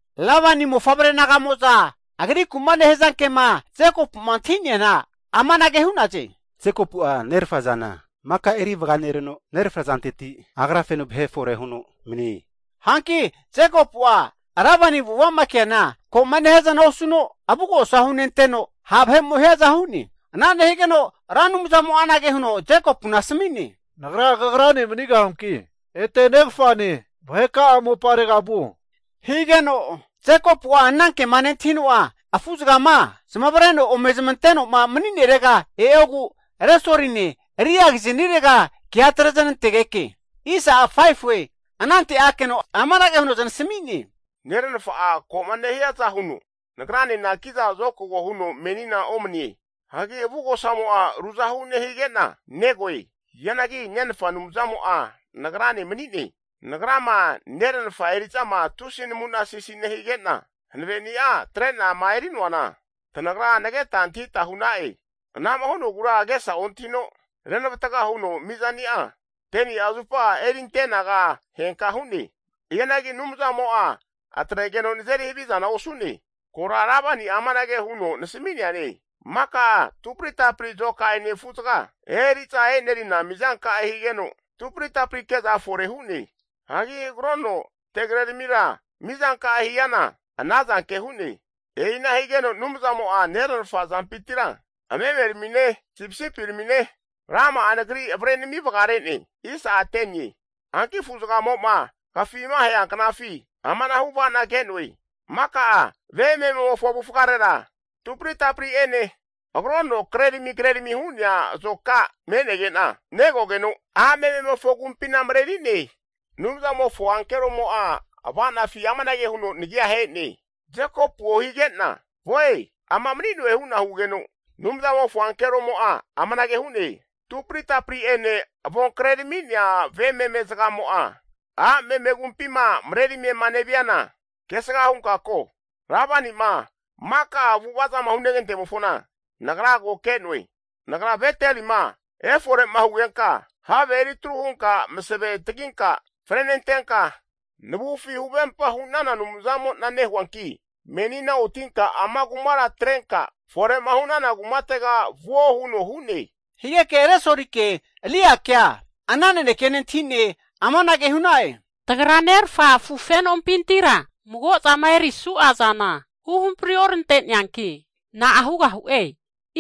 Lebani mofavre naga'mo'za agriku'ma nehaza ke'ma Jekopu'ma antahi'neana amanage hu'naze, Jekopu'a nerafa zana maka eri vaganereno, nerafa zanteti agra feno vahe fore huno manie. Hanki Jekopu'a Lebani avu'ava'ma keana ko'ma nehiaza osuno, avugosa hunenanteno ha' vahe'mo hiaza hu'ne. Ana nehigeno Ra Anumzamo'a anage huno Jekopuna asmi'ne, Nagra kagrane manigahuanki ete negafane vaheka'a moparega vuo. Higeno Jekopu'a ana kema nentahino'a afu'zagama zamavareno ome zamate'noma mani'nerega e'ogu, Resoline, Liagiznirega ke atreznantegeke, anante akeno amanage huno zanasmi'ne, neranafa'a ko'ma nehiaza huno nagranena kiza zokago huno menina omanie. Hagi avugosamo'a ruzahu nehige'na negoe. Hianagi nenfa Anumzamo'a nagrane mani'ne. Nagrama neranafa eri'zama tusi namu'na sisi nehige'na hanaveni'a atre'nama eri'noana, tanagra nageta antahita hu'na'e. Anama hu'nogura agesa ontahino, renavatga huno mizani'a 10ni'a zupa eri antenaga henka hu'ne. Hianagi Anumzamo'a atregeno nazeri havizana osu'ne. Kora Lebani'a amanage huno nasmi'neane, maka'a tupri tapri azoka'ene afu'zaga eri'za enerina mizanka'e, higeno tupri tapri ke'za fore hu'ne. Hagi agrono tegre ramira mizanka'e hiana, anazanke hu'ne. E'ina higeno Anumzamo'a neranafa azampintira memeramine, sipisipiramine, rama'a nagri avre nami vagare'ne. Hanki afu'zagamo'ma agafima ahea knafi amanahu ava'na ke'noe. Maka'a ve mememofo avufgarera tupri tapri ene agrono krerami krerami hu'nea azoka me'nege'na negogeno, a' mememofo agumpina mareri'ne. Anumzamofo ankeromo'a ava'nafi amanage huno nagia ahe'ne. Jekopuo! Hige'na ama mani'noe hu'na hugeno, Anumzamofo ankeromo'a amanage hu'ne, tupri tapri'ene avon krerami'nea ve meme zagamo'a a' meme agumpima marerime neviana, kesga hunka ko, Lebani'ma maka'a avu'ava zama hunegante'mofona, Nagra ko ke'noe. Nagra Betelima efore'ma hugenka have eri atru hunka masave taginka frenentenka navufi huvempa hu'nana Anumzamo'na nehuanki menina otinka ama kumara atrenka, fore'ma hu'nana kumatega vuo huno hu'ne. Higeke Resolike, Liakea ana naneke nentahi'ne, amanage hu'na'e. Tagra nerafa afu fenompintira mago'zama erisu'a zana huhampri orante'neanki, na'a hugahu'e?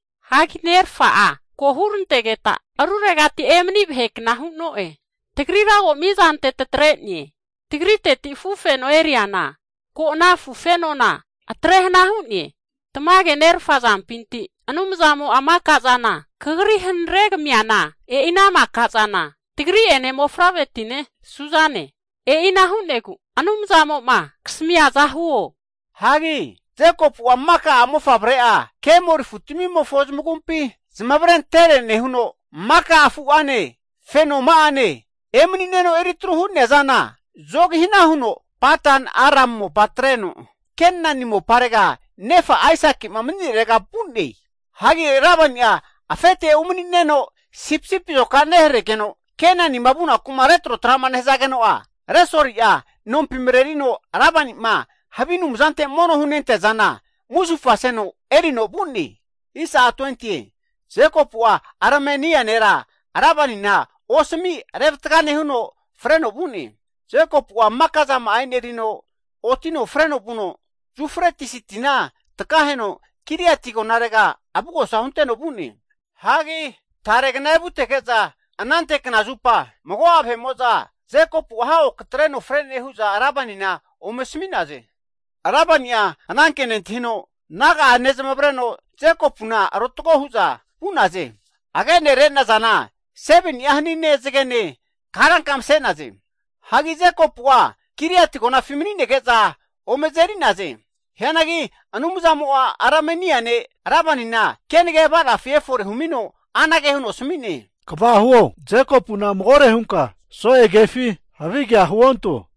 Hagi nerfa'a ko hurantegeta ruregati emani vahe kna hu'noe. Tagrira ko mizante tatre'ne, Tagriteti afufeno eriana ko ana afu fenona atre hana hu'ne. Tamage nerfa azampinti Anumzamo'a maka zana kagri hanare kamiana, e'i ana maka zana tagri'ene mofavre'tine suzane. E'ina hu'negu Anumzamo'ma kasami'niaza huo. Hagi Jekopu'a maka a'mofavre'a, kemori afutamimofo zamagumpi zamavarentere nehuno, maka'a afu'ane, fenoma'ane emani'neno eritru hu'nea zana zogi hana huno Padan-Aram mopa atreno, Kenani moparega nefa Aisaki'ma mani'nerega vu'ne. Hagi Lebani'a afete umani'neno, sipisipi azoka neharegeno, Kenanima vunaku'ma retrotra nehazageno'a, Resoli'a nompi marerino Lebani'ma havi anumzante mono hunentea zana, musufa seno erino vu'ne. Jekopu'a Arameania nera Lebanina osami revatga nehuno freno vu'ne. Jekopu'a maka zama'a enerino otino fre'no vuno, Yufretis tina takaheno Gileati agonarega avugosa hunteno vu'ne. Hagi taregna evutege'za anante knazupa mago'a vahe'mo'za, Jekopu'a hago katreno fre'ne hu'za Lebanina ome asami'naze. Lebani'a ananke nentahino naga'a nezamavareno Jekopuna arotgo hu'za vu'naze. Hagi agene re'nazana 7ni'a hanine, zagene karanka mase'naze. Hagi Jekopu'a Gileati agonafi mani'nege'za ome azeri'naze. Hianagi Anumzamo'a Arameani ne' Lebanina kenage ava'nafi efore humino anage huno asami'ne, Kva huo, Jekopuna magore hunka so'e kefi havigea huonto.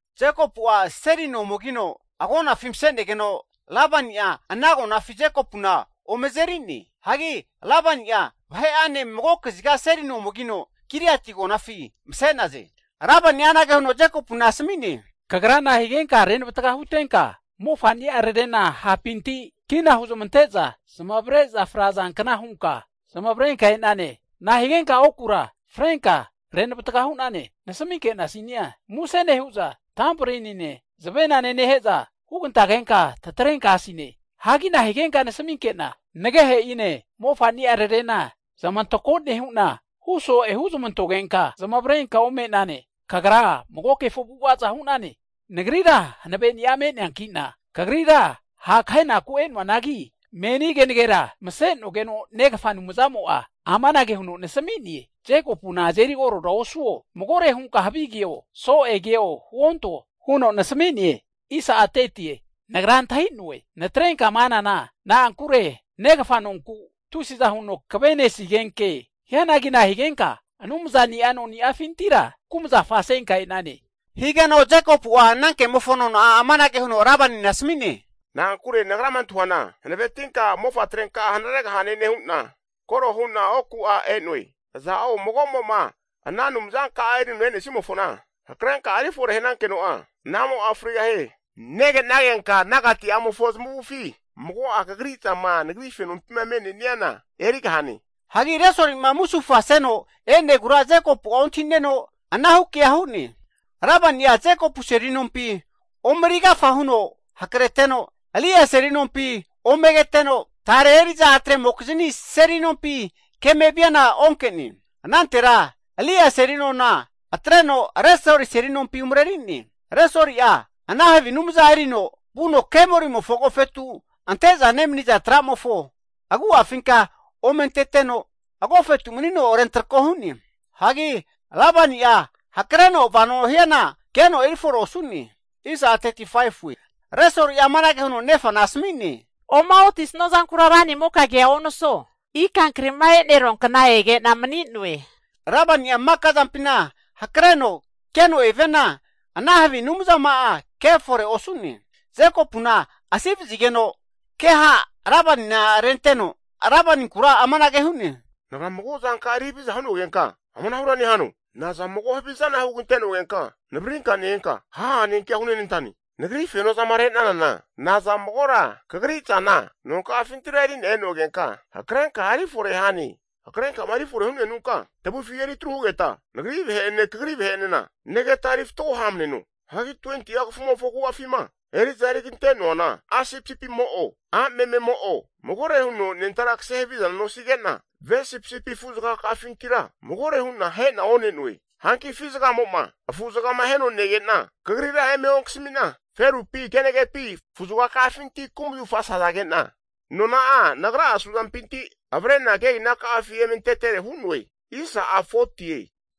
Jekopu'a seli no omegino agonafi mase'negeno, Lebani'a ana agonafi Jekopu'na ome azeri'ne. Hagi Lebani'a vahe'ane mago kaziga seli no omegino, Gileati agonafi mase'naze. Lebani'a anage huno Jekopuna asami'ne, Kagra nahigenka renavatga hutenka mofani'ararena hapinti kina huzmante'za zamavare'za frazankna hunka zamavarenka e'nane? Nahigenka okura frenka renavatga hu'nane, nasminke'nasinia, muse nehu'za tambori'nine, zavena nehe'za hugantagenka tatrenka asine. Hagi nahigenka nasminke'na nagehe'ine, mofani'ararena zamantako nehu'na huso'e huzmantogenka zamavarenka ome'nane? Kagra mago kefo avu'avaza hu'nane. Nagrira hanaveni'a me'neankina, kagrira ha' kahenaku e'noanagi, meni kenagera masenogeno negafa Anumzamo'a amanage huno nasmi'ne, Jekopuna azeri koro osuo, magore hunka havi keo, so'e keo huonto huno nasmi'ne. Nagra antahi'noe natrenka'ma anana, na'ankure negafa nonku tusiza huno kvenesigenke. Hianagi nahigenka anumzani'a noni'afintira kumzafa senka e'nane? Higeno Jekopu'a ana kemofo nona'a amanage huno Lebanina asami'ne, Na'ankure nagrama antahuana hanavetinka mofa trenka'a hanaregahane nehu'na koro hu'na oku'a e'no'e. Aza'o mago'mo'ma ana anumzanka'a erino e'nesnimofona hakrenka erifore hanankeno'a, anamo'a frigahie. Nege'nagenka nagati'amofo zamufi mago'a kagri zama nagri fenompima me'neniana erigahane. Hagi Resoli'ma musufa seno e'negura Jekopu'a ontahi'neno, anahu kea hu'ne. Lebani'a, Jekopu seli nompi ome agafa huno hakreteno, Lia seli nompi ome keteno, tare eri'za a' tremokizni seli nompi keme viana onke'ne. Anantera Lia seli nona atreno Resoli seli nompi umareri'ne. Resoli'a ana havi anumza erino vuno kemorimofo agofetu ante'za nemaniza tra'mofo agu'afinka ome anteteno, agofetu manino rentrako hu'ne. Hagi Lebani'a hakreno vano hiana keno eri fore osu'ne. Resoli'a amanage huno nefana asami'ne, O'maotisnua zankura ranimoka kea onasuo, ika kri'ma enerua kna ege'na mani'noe. Lebani'a maka zampina hakreno keno eviana ana havi anumzama'a kefore osu'ne. Jekopuna asi vazigeno ke ha' Lebanina renteno, Lebaninkura amanage hu'ne, Nagra mago zanka'a eri haviza hu'nogenka amanahura nehano? Naza mago havizana hugante'nogenka navaririnka ne-enka, haha'ene kea hunenantane? Nagri feno zama re'nanana, naza magora kagri zana nonka'afintira eri'na e'nogenka hakrenka erifore hane? Hakrenkama erifore hu'nenunka, tavufi eri atru hugeta, nagri vahe'ene, kagri vahe enena negeta eri fatgo ha'mneno. Hagi 20'a kafumofo agu'afima eri'za erigante'noana a' sipisipimo'o, a' mememo'o magore huno anentara kase havizana, nosige'na ve sipisipi afu zagaka'afintira magore hu'na ahena one'noe. Hanki afi zagamo'ma afu'zagama aheno nege'na, kagrira eme onkasami'na, ferupi kenagepi afu'zagafinti kumazafa sazage'na, nona'a nagra'a suampinti avre'na kegina ka'afi eme antetere hu'noe.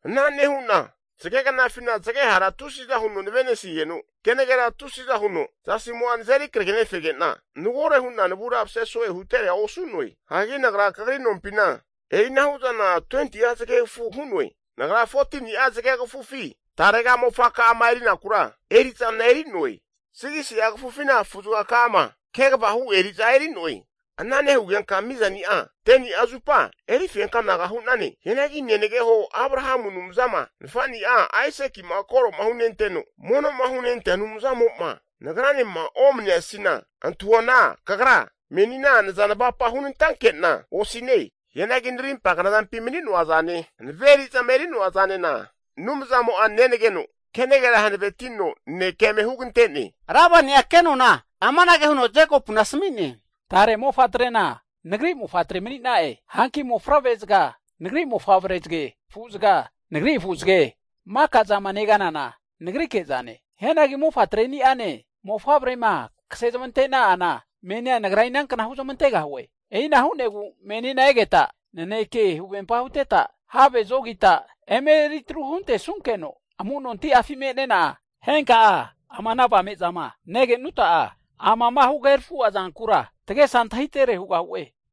Ana nehu'na zage knafina zage hara tusiza huno nave'nesigeno, kenagera tusiza huno zasimo'a nazeri kragenefege'na, magore hu'na navura mase so'e hutere osu'noe. Hagi nagra kagri nompina e'inahu zana 20'a zagegafu hu'noe. Nagra 14ni'a zagegfufi tarega mofaka'ama eri'nakura eri'zana eri'noe. 6si'a kafufina afu'zagaka'ama kegava hu eri'za eri'noe. Ana nehugenka mizani'a 10ni'a zupa eri fenka anaga hu'nane. Hianagi nenageho Abrahamu Anumzama, nafa'nia Aisaki'ma koro hunenteno mono'ma hunentea Anumzamo'ma nagranema omani'nesina, antahuana kagra menina naza navapa hunantanke'na osine. Hianagi narimpa knazampi mani'noa zane hanave eri'zama eri'noa zanena Anumzamo'a nenageno, kenagera hanavetino nanekea eme hugantene. Lebani'a ke nona amanage huno Jekopuna asmi'ne, Tare mofatrena nagri mofatre mani'na'e. Hanki mofavre zaga nagri mofavre zage, afu'zaga nagri afu'zage, maka zama neganana nagrike zane. Hianagi mofatreni'ane mofavrema kase zamante'na'ana menina nagra inankna huzmantegahue? E'ina hu'negu menina egeta, naneke huvempa huteta, have zogita emeri atru huntesukeno amu'nonti'afi me'nena, henka ama ana avamezama negenuta'a, amama huhagerafu'a zankura tagesa antahitere hugahu'e.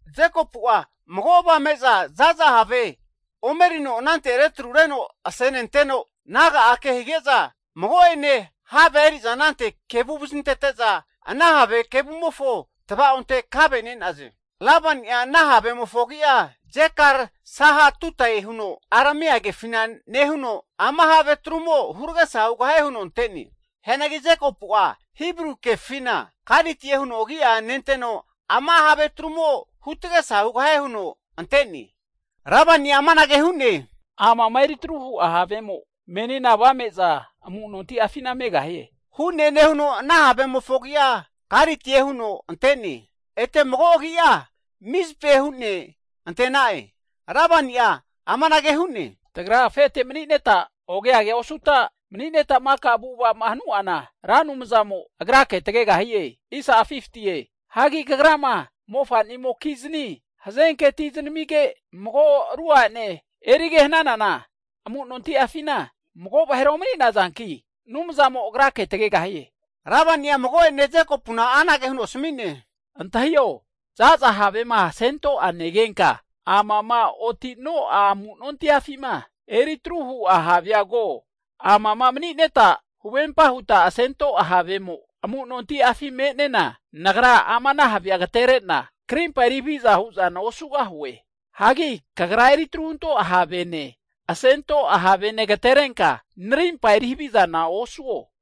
Jekopu'a mago avame'za za'za have ome erino anante retrureno asenenteno, naga'a ke hige'za mago'ene havea eri'za anante kevu vazintete'za, ana have kevumofo tvaonte kave ne'naze. Lebani'a ana havemofo agi'a Jegar-sahaduta'e huno Aramea kefina nehuno, Ama have atrumo huragesa hugahie huno ante'ne. Hianagi Jekopu'a Hibru kefina Galitie huno agi'a nenteno, ama have atrumo hu tagesa hugahie huno ante'ne. Lebani'a amanage hu'ne, amama eritru hu'a havemo menina avame'za amu'nonti'afina megahie. Hu'ne nehu'ne ana havemofo agi'a Galitie hu'ne ante'na'e. Ete mago agi'a Mizpae hu'ne ante'na'e. Lebani'a amanage hu'ne. Tagra afete mani'neta oge age osuta mani'neta maka avu'ava'ma hanu'ana, Ra Anumzamo agrake tagegahie. Hagi kagrama mofa'nimokizni hazenke ati zanamige, mago ru a'ne erige hananana, amunonti'afina magora vahera omani'nazanki Anumzamo agrake tagegahie. Lebani'a mago'ene Jekopuna anage huno asami'ne, Antahio, za'za havema asento'a negenka, amama oti'no'a amu'nontiafima eri atru hu'a havea ko. Amama mani'neta huvempa huta asento'a havemo, amu'nontiafi me'nena, nagra ama ana havea agatere'na krimpa eri haviza hu'zana osugahue. Hagi kagra eri atru hunto'a havene, asento'a havene agaterenka narimpa eri havizana osuo.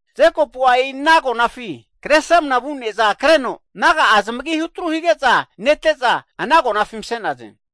Jekopu'a e'i ana agonafi Kresramana vu ne'za kreno Anumzamofontega ofa hunenteno naga'a zamagi hutru hige'za nete'za, ana agonafi mase'naze.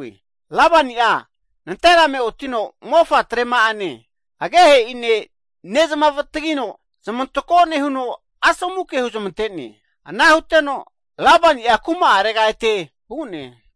Lebani'a nanterame otino mofatrema'ane, agehe'ine nezmavatagino zamantako nehuno, asomu ke huzmante'ne. Ana huteno, Lebani'a kuma'arega ete vu'ne.